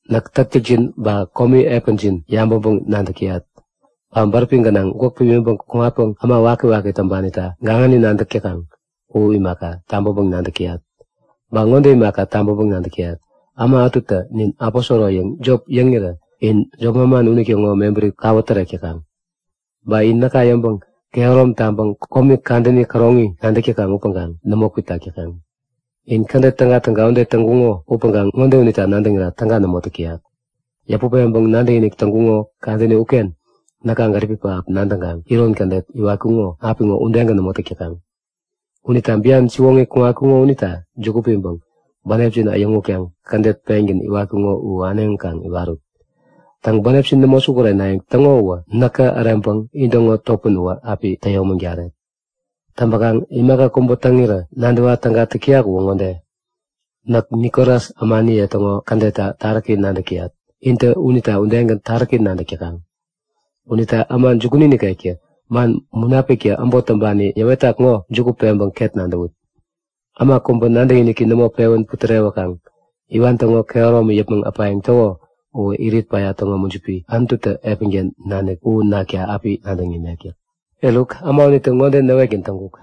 Näk täktäkjin ba komi epänjin yabäŋpäŋ-nadäk täyat. Ba bäräpi gänaŋ gwäk pimiŋpäŋ kuŋatpäŋ äma wakiwaki täŋpanita gaŋani nadäk täkaŋ u imaka, tabäŋpäŋ-nadäk täyat. Ba ŋode imaka tabäŋpäŋ-nadäk täyat; Äma ätutä nin aposoro yäŋ jop yäŋirä in jop manman unitäŋo mebäri kawä täreŋkuk. Ba in näka yäŋpäŋ kehärom taŋpäŋ komi kadäni käroŋi nadäk täkaŋ upäŋkaŋ nämo kwitak täkaŋ. In kädet tägatäga ude täŋkuŋo upäŋkaŋ ŋode unita nadäŋira täga nämo täyak; Yäput peŋpäŋ nadäkinik täŋkuŋo kadäni uken näka gäripi pähap nadäŋkaŋ iron kädet iwatkuŋo apiŋo udegän nämo täk täkaŋ. Unita bian siwoŋi kuŋatkuŋo unita juku piŋpäŋ bänepjin äyäŋutkaŋ kädet pengän iwatkuŋo u äneŋi kaŋ iwarut. Täŋ, bänepjin nämo sukurenayäŋ täŋo uwä näkä äreŋpäŋ intäŋo topän uwä api täyomägaret. Täŋpäkaŋ imaka kubä täŋirä nadäwa täga täyak uwä ŋode; Näk Nikolas ämaniye täŋo kädetta taräki nadäk täyat intä unita udegän taräki nadäk täkaŋ. Unita äma jukuni nikektä man Munapiktä äbot täŋpani yäwetak ŋo juku peŋpäŋ ket nadäwut. Äma kubä nadäkiniki nämo pewän putärewänkaŋ iwan täŋo kehäromi yäpmäŋ äpayäŋ täko uwä irit päya täŋo mujipi, Anututä epänken nanik u nakta api nadäŋ imet yäk. Eruk äma unitä ŋode näwetgän täŋkuk;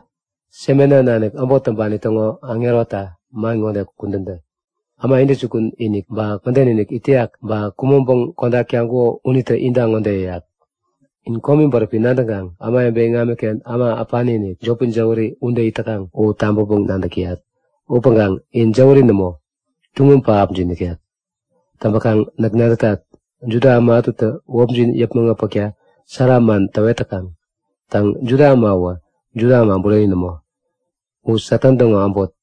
Smena nanik äbot täŋpani täŋo aŋeronita man ŋode kudän tä; Äma intäjukun-inik ba mäden-inik it täyak, ba kumäŋpäŋ kodak taŋkuko unitä inta ŋode yäyak; In komi bäräpi nadäŋkaŋ ämawebe iŋamiken äma äpani-inik, jopi jäwäri ude it täkaŋ u tabäŋpäŋ-nadäk täyat. (Upäŋkaŋ in jäwäri nämo, tuŋum pähapjin nikek.) Täŋpäkaŋ näk nadätat, Juda äma ätutä wäpjin yäpmäŋ äpäkta sära man täwet täkaŋ. Täŋ, Juda äma uwä Juda äma bureni nämo, u Satan täŋo äbot.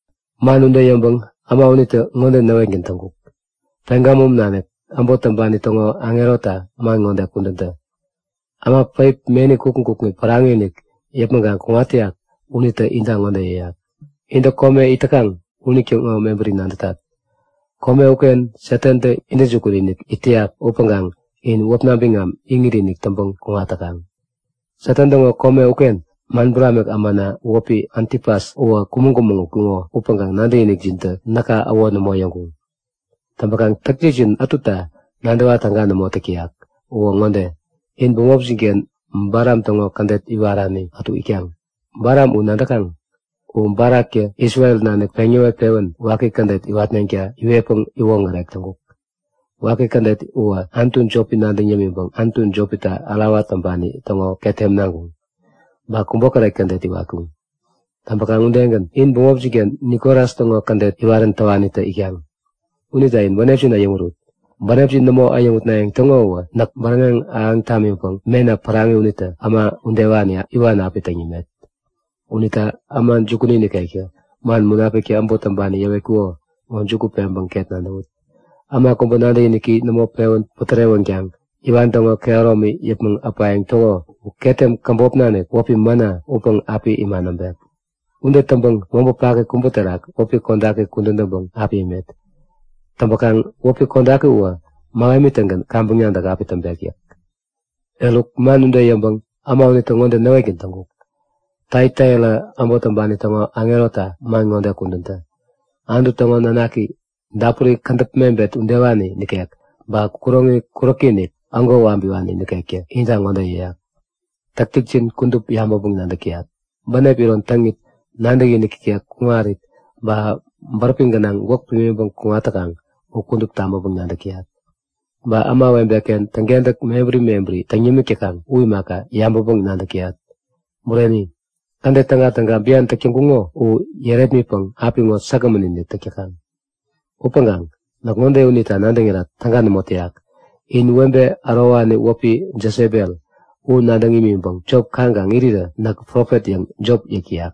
Man ude yäŋpäŋ äma unitä ŋode näwetgän täŋkuk; Pegamum nanik äbot täŋpani täŋo aŋeronita man ŋode kudän tä; Äma päip meni kukŋi kukŋi päraŋi-inik yäpmäŋ kuŋat täyak unitä inta ŋode yäyak; Intä kome it täkaŋ unitäŋo mebäri nadätat. Kome uken Satantä intäjukun-inik it täyak upäŋkaŋ in wäpna biŋam iŋit-inik täŋpäŋ kuŋat täkaŋ. Satan täŋo kome uken man buramik ämana wäpi Antipas uwä kumäŋ-kumäŋ utkuŋo upäŋkaŋ nadäkinikjintä näka äwo nämo yäŋkuŋ. Täŋpäkaŋ täktäkjin ätuta nadäwa täga nämo täk täyak uwä ŋode; In bämopjin-ken Balam täŋo kädet iwarani ätu itkaŋ. Balam u nadäkaŋ. U Balaktä Isrel nanik peŋ yäwet-pewän waki kädet iwatneŋta iwetpäŋ iwoŋärek täŋkuk. Waki kädet uwä anutu jopi nadäŋ yämiŋpäŋ anutu jopita ärawa täŋpani täŋo ketem naŋkuŋ, ba kubokäret kädet iwatkuŋ. Täŋpäkaŋ udegän, in bämopjin-ken Nikolas täŋo kädet iwarän täwanitä itkaŋ. Unita in bänepjin äyäŋurut. Bänepjin nämo äyäŋutnayäŋ täŋo uwä näk bäräŋek ahäŋ tamiŋpäŋ mena päraŋi unitä äma udewani iwan api täŋ yämet. Unita äma jukuni nikektä man Munapiktä äbot täŋpani yäwetak ŋo juku peŋpäŋ ket nadäwut. Äma kubä nadäkiniki nämo pewän putärewänkaŋ iwan täŋo kehäromi yäpmäŋ äpayäŋ täko uwä ketem käbop nanik wäpi mana upäŋ api ima näŋpek. Ude täŋpäŋ mobä paki kubä terak wäpi kodaki kudän täŋpäŋ api imet. Täŋpäkaŋ wäpi kodaki uwä mähemi-tägän kaŋpäŋ nadäk api täŋpek yäk. Eruk man ude yäŋpäŋ äma unitä ŋode näwetgän täŋkuk; Taiataira äbot täŋpani täŋo aŋeronita man ŋode kudän tä; Anutu täŋo nanaki, dapuri kädäp mebet udewani nikek ba kuroŋi kuräki-inik, ägo wabiwani nikektä inta ŋode yäyak; Täktäkjin kudup yabäŋpäŋ-nadäk täyat. Ba bänep iron täŋit, nadäkinik ikek kuŋarit, ba bäräpi gänaŋ gwäk pimiŋpäŋ kuŋat täkaŋ u kudup tabäŋpäŋ-nadäk täyat. Ba ämawebe-ken täŋkentäk mebäri mebäri täŋ yämik täkaŋ u imaka, yabäŋpäŋ-nadäk täyat. Bureni, kädet tägatäga bian täk täŋkuŋo u yärepmitpäŋ apiŋo säkgämän-inik täk täkaŋ. Upäŋkaŋ näk ŋode unita nadäŋira täga nämo täyak; In webe ärowani wäpi Jesebel u nadäŋ imiŋpäŋ jop kaŋkaŋ irirä näk profet yäŋ jop yäk täyak.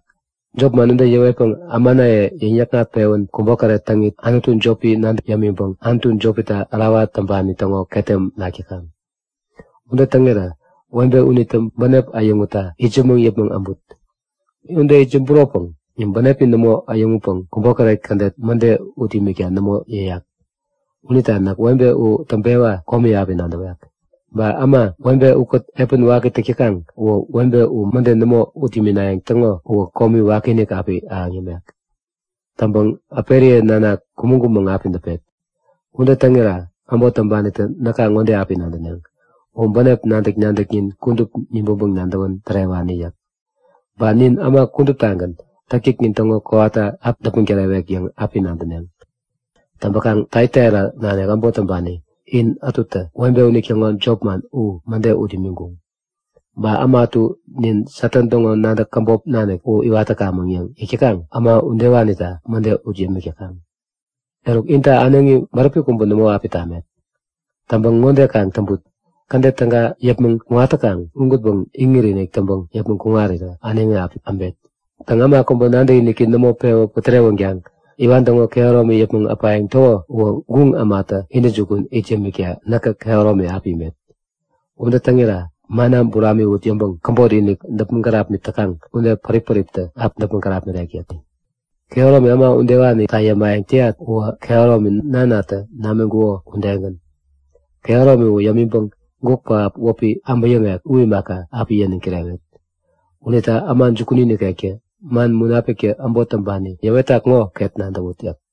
Jop man ude yäwetpäŋ ämanaye yäŋ-yäkŋat-pewän kubokäret täŋit anutu jopi nadäŋ yämiŋpäŋ anutu jopita ärawa täŋpani täŋo ketem nak täkaŋ. Ude täŋirä webe unitä bänepi äyäŋutta itsämäŋ yäpmäŋ äbut. Ude itsämburopäŋ bänepi nämo äyäŋutpäŋ kubokäret kädet mäde ut imikta nämo yäyak. Unita näk webe u täŋpewa komi api nadäwek. Ba äma, webe ukät epän waki täk täkaŋ unitä webe u mäde nämo ut iminayäŋ täŋo uwä komi wakiinik api ahäŋ yämek. Täŋpäŋ äperiye nanak kumäŋ-kumäŋ api däpet. Ude täŋira äbot täŋpanitä näka ŋode api nadäneŋ; U bänep nadäk-nadäknin kudup nibäŋpäŋ nadäwän tärewani yäk. Ba nin äma kuduptagän täktäknin täŋo kowata api däpmäŋ tärewek yäŋ api nadäneŋ. Täŋpäkaŋ Taiataira nanik äbot täŋpani in ätutä webe unitäŋo jopman u mäde ut imiŋkuŋ. Ba äma ätu Nin Satan täŋo nadäk käbop nanik u iwat täkamäŋ yäŋ yäk täkaŋ äma udewanita mäde ut yämik täkaŋ. Eruk inta äneŋi bäräpi kubä nämo api tamet. Täŋpäŋ ŋode kaŋ täŋput; Kädet täga yäpmäŋ kuŋat täkaŋ ugänpäŋ iŋit-inik täŋpäŋ yäpmäŋ kuŋarirä äneŋi api äbet. Täŋ, äma kubä nadäkiniki nämo pewän putärewänkaŋ iwan täŋo kehäromi yäpmäŋ äpayäŋ täko uwä guŋ ämata intäjukun it yämikta näkä kehäromi api imet. Ude täŋira mana buramiwut yäŋpäŋ käbotinik däpmäŋ kärapmit täkaŋ ude pärip-päriptä api däpmäŋ kärapmirek yäk. Kehäromi, äma udewanita yämayäŋ täyat uwä kehäromi Nanatä namiŋkuko udegän. Kehäromi u yämiŋpäŋ guk pähap wäpi äbäyäŋek u imaka, api yäniŋ kirewet. Unita äma jukuni nikektä man Munapiktä äbot täŋpani yäwetak ŋo ket nadäwut yäk.